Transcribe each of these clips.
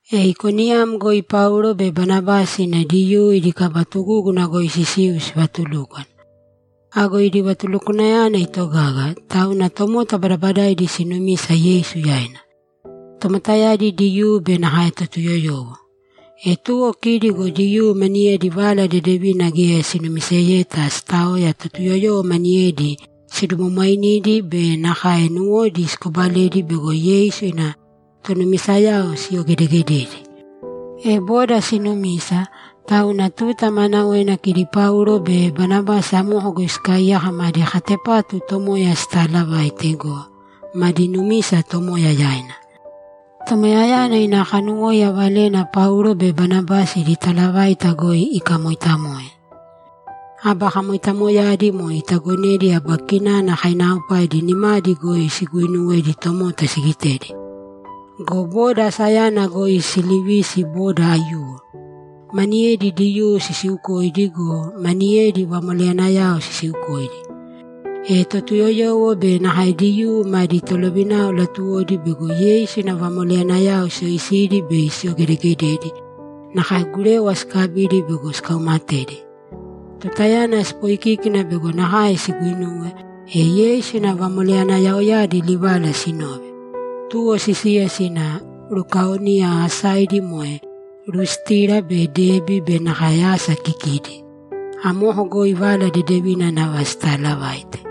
E Ikoniyam goi Paulo be Banabasi sina Diyuu idi kaba tugúguna goi sisiu sivatulúkwana. Ago idi vatulukwanayana itogaga, tauna tomota badabadaidi sinumisa Yeisu yaina; tomotayadi Diyuu be nakae Totuyoyowo. E tuwo kidi go Diyuu maniyedi Vala Dedevina geya sinumiseyeta sitaoya Totuyoyowo maniyedi sidumwamwainidi be nakae nuwodi sikobaledi bego Yeisu ina tonumisayao siyogedegededi. E boda sinumisa, tauna tuta maanawena kidi Paulo be Banabasi amoko goi sikaaiyaka madi katepatu Tomoya sitalavaite go, madi numisa Tomoya yaina. Tomoyayana ina kanuwóiya valena Paulo be Banabasi idi talavaita goi ikamoitamoe. Aba kamoitamoyadi moe itagonedi aba kinana kainaaopaidi nimadi goi siguinuwedi tomota sigitedi. Go boda asayana goi silivisi boda aiyuwo. Maniyedi Diyuu sisiukoidi go, maniyedi vamoleyanayao sisiukoidi. E Totuyoyowo be nakae Diyuu madi tolovinao latuwodi bego Yeisu ina vamoleyanayao siyoisidi bei siyogedegededi, nakae gurewa sikabidi bego sikaumatedi. Tutayana sipoikíkina bego nakae siguinuwe, e Yeisu ina vamoleyanayaoyadi livala sinove, tuwo sisiya sina Lukaonia asaidi moe Lustira be Debi be nakae asa kikidi. Amoko goi Vala Dedevina nava sitaalavaite.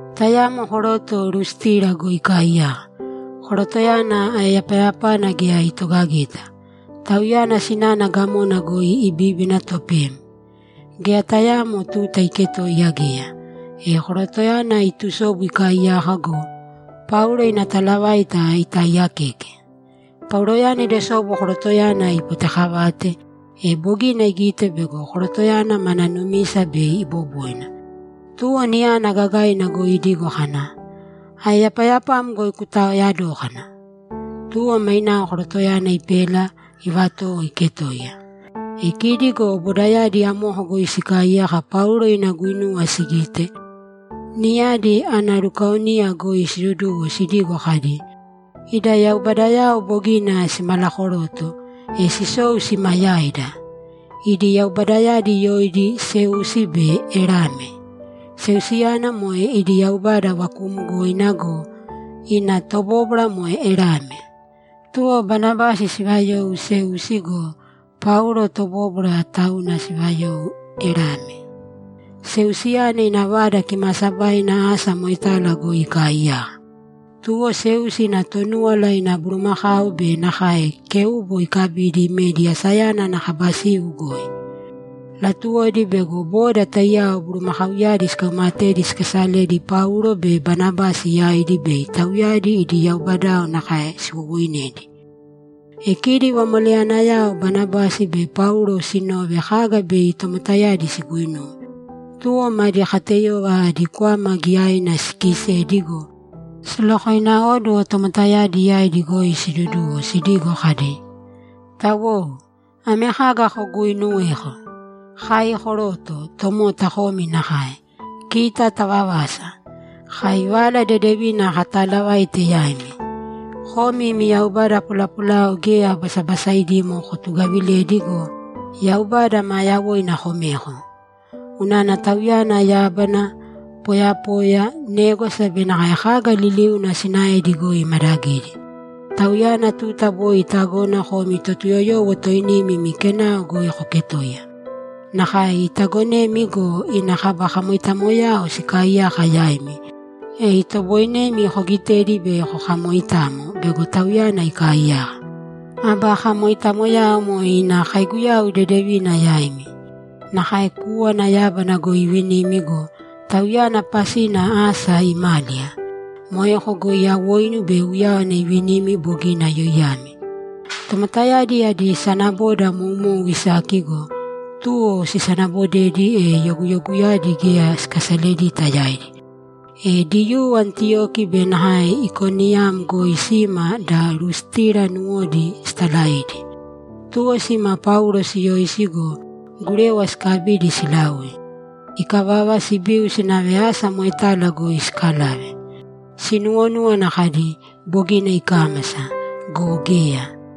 Tayamo koroto Lustira goi ikaaiyaka. Korotoyana aeyapayapana geya sitogageta. Tauyana sinana gamona goi ibíbina topem. Geya tayaamo tuta iketoiya geya. E korotoyana itusobu ikaaiyaka go, Paulo ina talavaita itaaiyakeke. Pauloyana idosobu korotoyana ipotekavate, e bogina igite bego korotoyana mana numisa bei iboboina. Tuwo niyana gagaina goi idigo kana, ‘Aeyapayapam goi kutaoya dōkana!’ Tuwo mainao korotoyana ipela, ivatowo iketoiya. E kidi go bodayadi amoko goi sikaaiyaka Paulo ina guinuwa sigite, niyadi analukaonia goi siduduwo sidigo kadi, ‘Ida yaubadayao bogina simalakoroto, e sisou sima yaida!’ Idi yaubadayadi yoidi Seusi be Erame. Seusiyana moe idi yaubada vakuumgoina go, ina tobóbwara moe Erame. Tuwo Banabasi sivayou Seusi go, Paulo tobóbwara, tauna sivayou Erame. Seusiyana ina vada kimaasabaina asa moetala goi ikaaiyaka. Tuwo Seusi ina Tonúwala ina bulumakau be nakae kéubo ikabidi imedi asayana ana kaba siu goi. Latuwodi bego boda taiyao bulumakauyadi sikaumatedi sikasaledi Paulo be Banabasi yaidi bei tauyadi idi yaubadayao nakae siwowoinedi. E kidi vamoleyanayao Banabasi be Paulo sinove kaga bei tomotayadi siguinuwe, tuwo madi kateyova adi kwama giyaina sikiisedi go, silokoináoduwo tomotayadi yaidi goi siduduwo sidigo kadi, ‘Tawou, ame kaga koguuinuweko? Kai koroto; tomota komi nakae. Kita tavavasa! Kai Vala Dedevina kataalavaite yaimi. Komi imi yaubada polapolayao geya basabasaidimo kotugavilēdi go, Yaubada maa yawoina komēko. Unana Tauyana yábana, poyapoya, négwasa be nakae kaga liliuna sinaedi goi imadagidi. Tauyana tuta boi itagona komi Totuyoyowo toinimi imi kenao goi koketoiya. Nakae itagonemi go, ina kaba kamoitamoyao sikaaiyaka yaimi, e itoboinemi kogitedi bei kokamoitamo bego Tauyana ikaaiyaka. Aba kamoitamoyao moe ina kaiguyau dedevina yaimi. Nakae kúwana yábana goi ivinimi go, Tauyana pasina asa imáliya. Moeko goi awoinu be uyáwana ivinimi bogina yoiyami.’ Tomotayadi adi sanaboda moumou isaki go, tuwo sisanabodedi, e yoguyoguyadi geya sikasaledita yaidi. E Diyuu Antiyoki be nakae Ikoniyam goi sima da Lustira nuwodi sitalaidi. Tuwo sima Paulo siyoisi go, gurewa sikabidi silaui. Ikavava, sibiu sinave asa moetala goi sikalave. Sinuwonúwana kadi, ‘Bogina ikámasa.’ Go geya!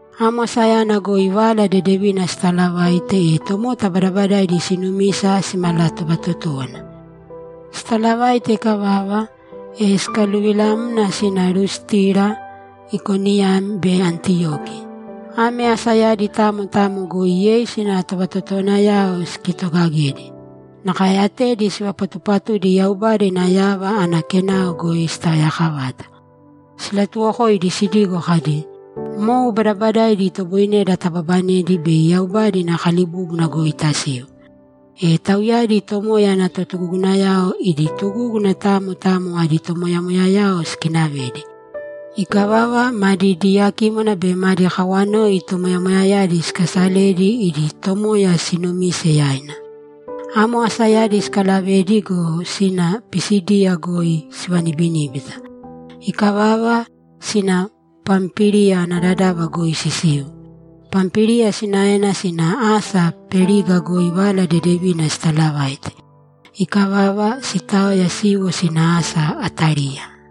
Amo asayana goi Vala Dedevina sitalavaite, e tomota badabadaidi sinumisa simalatovatotówana. Sitalavaite ikavava, e sikaluvilamna sina Lustira, Ikoniyam be Antiyoki. Ame asayadi tamo tamo goi Yeisu ina tovatotowanayao sikitogagedi. Nakae atedi sivapatupatudi Yaubada ina yava ana kenao goi sitaoyakavata. Silatuwokoidi sidigo kadi, ‘Mou badabadaidi itoboineda tababanedi bei Yaubada ina kalibúbuna goi tasiu.’ E tauyadi Tomoya ana totugugunayao idi tugúguna tamo tamo adi tomoyamoyayao sikinavedi. Ikavava, madi diyakímwana be madi kawanoi tomoyamoyayadi sikasaledi idi Tomoya siinumise yaina. Amo asayadi sikalavedi go, sina Pisídiya goi sivanibiníbita. Ikavava, sina Pampíliya ana dadava goi sisiu. Pampíliya sinaena sina asa Periga goi Vala Dedevina sitalavaite. Ikavava, sitaoya siiwo sina asa Atáliya.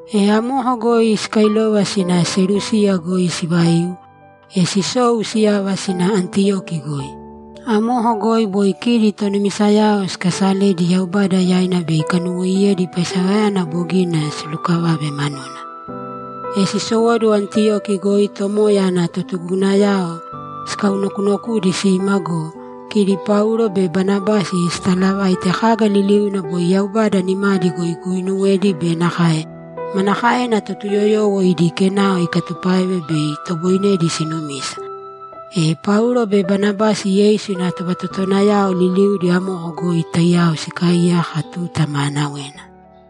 E amoko goi sikailova sina Selúsiya goi sivaiu, e sisou siyava sina Antiyoki goi. Amoko goi boi kidi tonumisayao sikasaledi Yaubada yaina bei ikanuwoiyedi paisewayana bogina silukavave manuna. E sisowóduwo Antiyoki goi Tomoya ana totugugunayao sikaunokunokudi sima go, kidi Paulo be Banabasi sitalavaite kaga liliuna boi Yaubada nimadi goi iguuinuwedi be nakae manakaena Totuyoyowo idi kenao ikatupáeve bei itoboinedi sinumisa. E Paulo be Banabasi Yeisu ina tovatotowanayao liliudi amoko goi taiyao sikaaiyaka tuta maanawena.